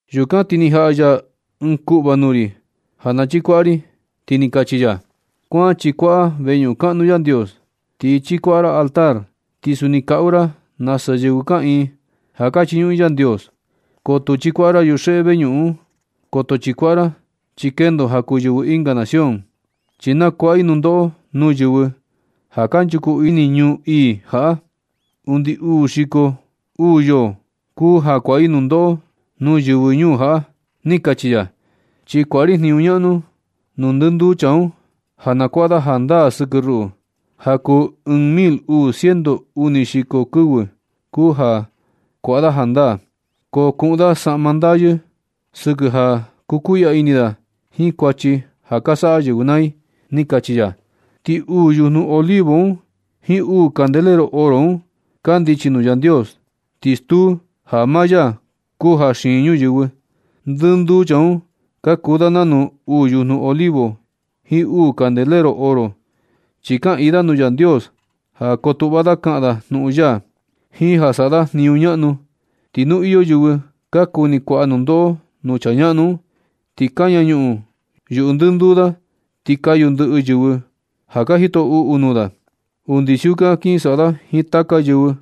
Yukan ti ni jaꞌa ya ɨɨn kuꞌva nuu ri ja na chikuaꞌa ri, ti ni kachi ya: ―Kuan chikuaꞌa veñuꞌun kaꞌnu Yandios. Ti chikuaꞌa ra altar. Ti suni kaꞌu ra nasa yɨvɨ kaꞌiin ja ka chiñuꞌun i Yandios. Ko tu chikuaꞌa ra yuxeꞌe veñuꞌun un. Koto chikuaꞌa ra, chi kendo ja kuu yɨvɨ ɨnga nación. Chi na kuaꞌa i nundoꞌo nuu yɨvɨ ja kanchuku ini ñuu ii jaꞌa. Undi uu xiko uu yoo kuu ja kuaꞌa i nundoꞌo nuu yɨvɨ ñuu jaꞌa ―ni kachi ya. Chi kuaꞌa ri jniñu ñaꞌnu nuu ndɨnduu chaa un ja na kuaꞌa da jandaa sɨkɨ ruꞌu. Ja kuu ɨɨn mil uu ciento uni xiko kɨvɨ kuu ja kuaꞌa da jandaa. Ko kuꞌun da saꞌma ndayɨ sɨkɨ ja kukuiꞌya ini da jiin kuachi ja ka saꞌa yɨvɨ naa i ―ni kachi ya. Ti uu yujnu olivo un jiin uu candelero oro un kandichi nuu Yandios. Ti stuu ja maa ya kuu ja xiin ñuyɨvɨ. Ndɨnduu chaa un ka kuu da nanu uu yujnu Olivo jiin uu candelero oro, chi kaꞌiin da nuu Yandios ja kotuꞌva da kaꞌan da jnuꞌun ya, jiin ja ka saꞌa da jniñu ñaꞌnu ya. Ti nu iyo yɨvɨ ka kuni kuaꞌa nundoꞌo nuu chaa ñaꞌnu un, ti kaña ñuꞌun yuꞌu ndɨnduu da ti kayu ndɨꞌɨ yɨvɨ ja ka jito uꞌu nuu da. Undi siukan kin saꞌa da jiin taka yɨvɨ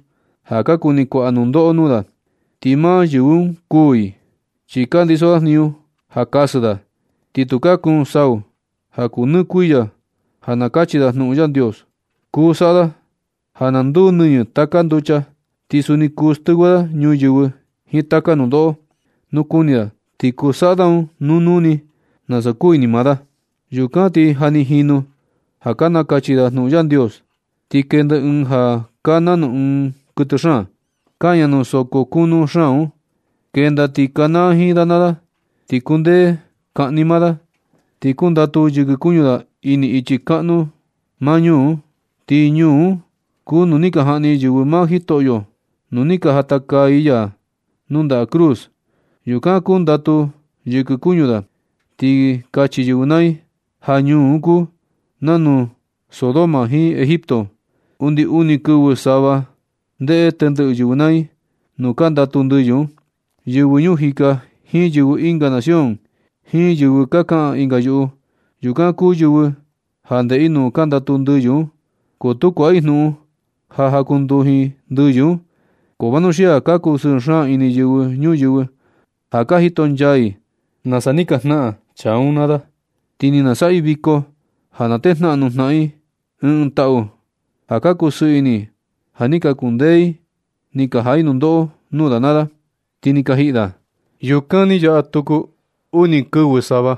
ja ka kuni kuaꞌa nundoꞌo nuu da. Ti maa yɨvɨ un kuū i. Chi ka ndiso da jniñu ka kasɨ da, ti tukaa kuun sau ja kuu nɨ kuiya ja nakachi da jnuꞌun Yandios. Kuu saꞌa da ja na nduu nɨñɨ taka nducha. Ti suni kuu stɨvɨ da ñuyɨvɨ jiin taka nundoꞌo. Nu kuni da ti kuu saꞌa da un nuu nuu ni, nasa kuu ini maa da. Yukan ti ja ni jinu ja ka nakachi da jnuꞌun Yandios, ti kenda ɨɨn ja kaa nanu ɨɨn kuɨtɨ xaan, kaña nuu soko kunu xaan un. Kenda ti kanaa jiin da naa da, ti kundee kaꞌni maa da. Ti kundatu yɨkɨ kuñu da ini ichi kaꞌnu maa ñuu un. Ti ñuu un kuu nuu ni ka jaꞌni yɨvɨ maa Jitoꞌyo, nuu ni ka jatakaa i ya nuu ndaꞌa cruz. Yukan kundatu yɨkɨ kuñu da. Ti kachi yɨvɨ naa i ja ñuu un kuu nanu Sodoma jiin Egipto. Undi uni kɨvɨ sava ndeꞌe tendɨꞌɨ yɨvɨ naa i nuu ka ndatu ndɨyɨ un. Yɨvɨ ñuu jika jiin yɨvɨ ɨnga nación jiin yɨvɨ ka kaꞌan ɨnga yuꞌu, yukan kuu yɨvɨ ja ndeꞌe i nuu ka ndatu ndɨyɨ un. Ko tu kuaꞌa i jnuꞌun ja jakunduji ndɨyɨ un. Ko vanuxia ka kusɨɨ xaan ini yɨvɨ ñuyɨvɨ ja ka jitonchaa i nasa ni ka jnaꞌan chaa un naa da. Ti na saꞌa i viko ja na tejnaꞌan nuu jnaꞌan i ɨɨn ɨɨn taꞌu ja ka kusɨɨ ini i, ja ni ka kundee i ni ka jaꞌa i nundoꞌo nuu da naa da, ti ni ka jiꞌi da. Yukan ni yaꞌa tuku uni kɨvɨ sava,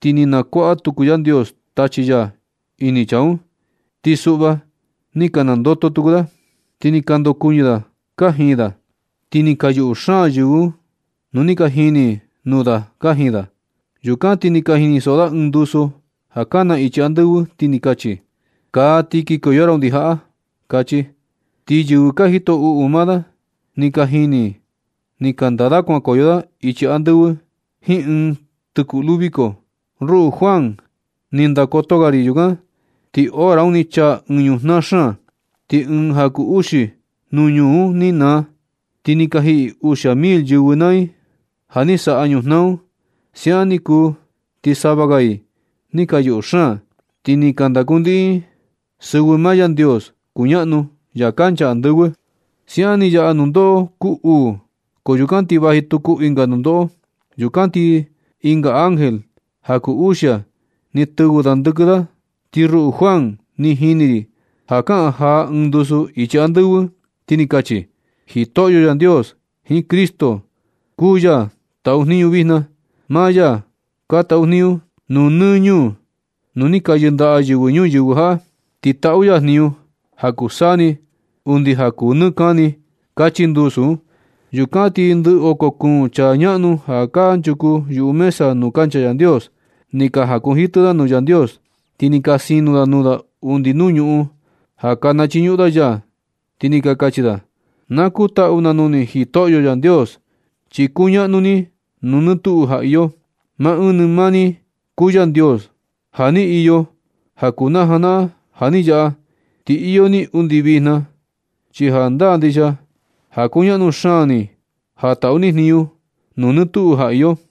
ti ni na kuaꞌa tuku Yandios tachi ya ini chaa un, ti suꞌva ni ka nandoto tuku da, ti ni ka ndokuɨñɨ da kajin da, ti ni ka yuꞌu xaan yɨvɨ nu ni ka jini i nuu da kajin da. Yukan ti ni ka jinisoꞌo da ɨɨn ndusu ja kana ichi andɨvɨ, ti kachi: ―Kaa ti kikoyo ra undi jaꞌa―kachi. Ti yɨvɨ ja ka jito uꞌu maa da, ni ka jini i ni ka ndaa da kuankoyo da ichi andɨvɨ jiin ɨɨn tɨkuꞌlu viko. Ruꞌu Juan, ni ndakoto ga ri yukan, ti hora un ni chaa ɨɨn ñujnaa xaan. Ti ɨɨn ja kuu uxi nuu ñuu un ni naa. Ti ni ka jiꞌi uxia mil yɨvɨ naa i ja ni saꞌa ñujnaa un. Siaꞌan ni kuu ti sava ga i ni ka yuꞌu xaan. Ti ni ka ndakuniꞌin i sɨvɨ maa Yandios kuñaꞌnu ya kancha andɨvɨ. Siaꞌan ni yaꞌa nundoꞌo kuu uu, ko yukan ti vaji tuku ɨnga nundoꞌo. Yukan ti ɨnga ángel ja kuu uxia, ni tɨvɨ da ndɨkiɨ. Ti ruꞌu Juan, ni jini ri ja kaꞌan jaa ɨɨn ndusu ichi andɨvɨ, ti ni kachi: Jitoꞌyo Yandios jiin Cristo, kuu ya ka taꞌu jniñu vijna. Maa ya ka taꞌu jniñu nuu nɨ ñuu, nuu ni ka yɨndaꞌa yɨvɨ ñuyɨvɨ jaꞌa. Ti taꞌu ya jniñu ja kuu saa ni undi ja kuu nɨ kani. Kachi ndusu un. Yukan ti ndɨ oko kuun chaa ñaꞌnu ja kanchuku yuꞌu mesa nuu kancha Yandios, ni ka jakunjitɨ da nuu Yandios, ti ni ka sino da nuu da undi nuu ñuꞌun ja ka nachiñuꞌun da ya, ti ni ka kachi da: Na kutaꞌu na nuu ni, Jitoꞌyo Yandios, chi kuñaꞌnu ni nuu nɨ tuꞌu ja iyo. Maa ɨɨn ni maa ni kuu Yandios ja ni iyo ja kuu na janaꞌan ja ni yaꞌa, ti iyo ni undi vijna. Chi jandaa ndixia ja kuñaꞌnu xaan ni ja taꞌu ni jniñu nuu nɨ tuꞌu ja iyo.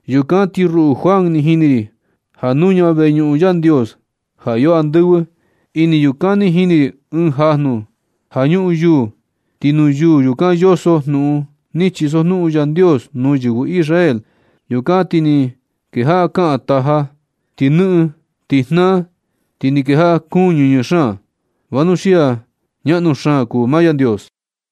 Yukan ti ruꞌu Juan, ni jini ri ja nuña veñuꞌun Yandios ja iyo andɨvɨ. Ini yukan ni jini ri ɨɨn jajnu ja ñuꞌun yuu, ti nuu yuu yukan yoso jnuꞌun ni chisojnuꞌun Yandios nuu yɨvɨ Israel. Yukan ti ni kejaꞌa kaꞌan taja, ti nɨꞌɨn, ti jnaa, ti ni kejaꞌa kuun ñɨñɨ xaan, vanuxia ñaꞌnu xaan kuu maa Yandios.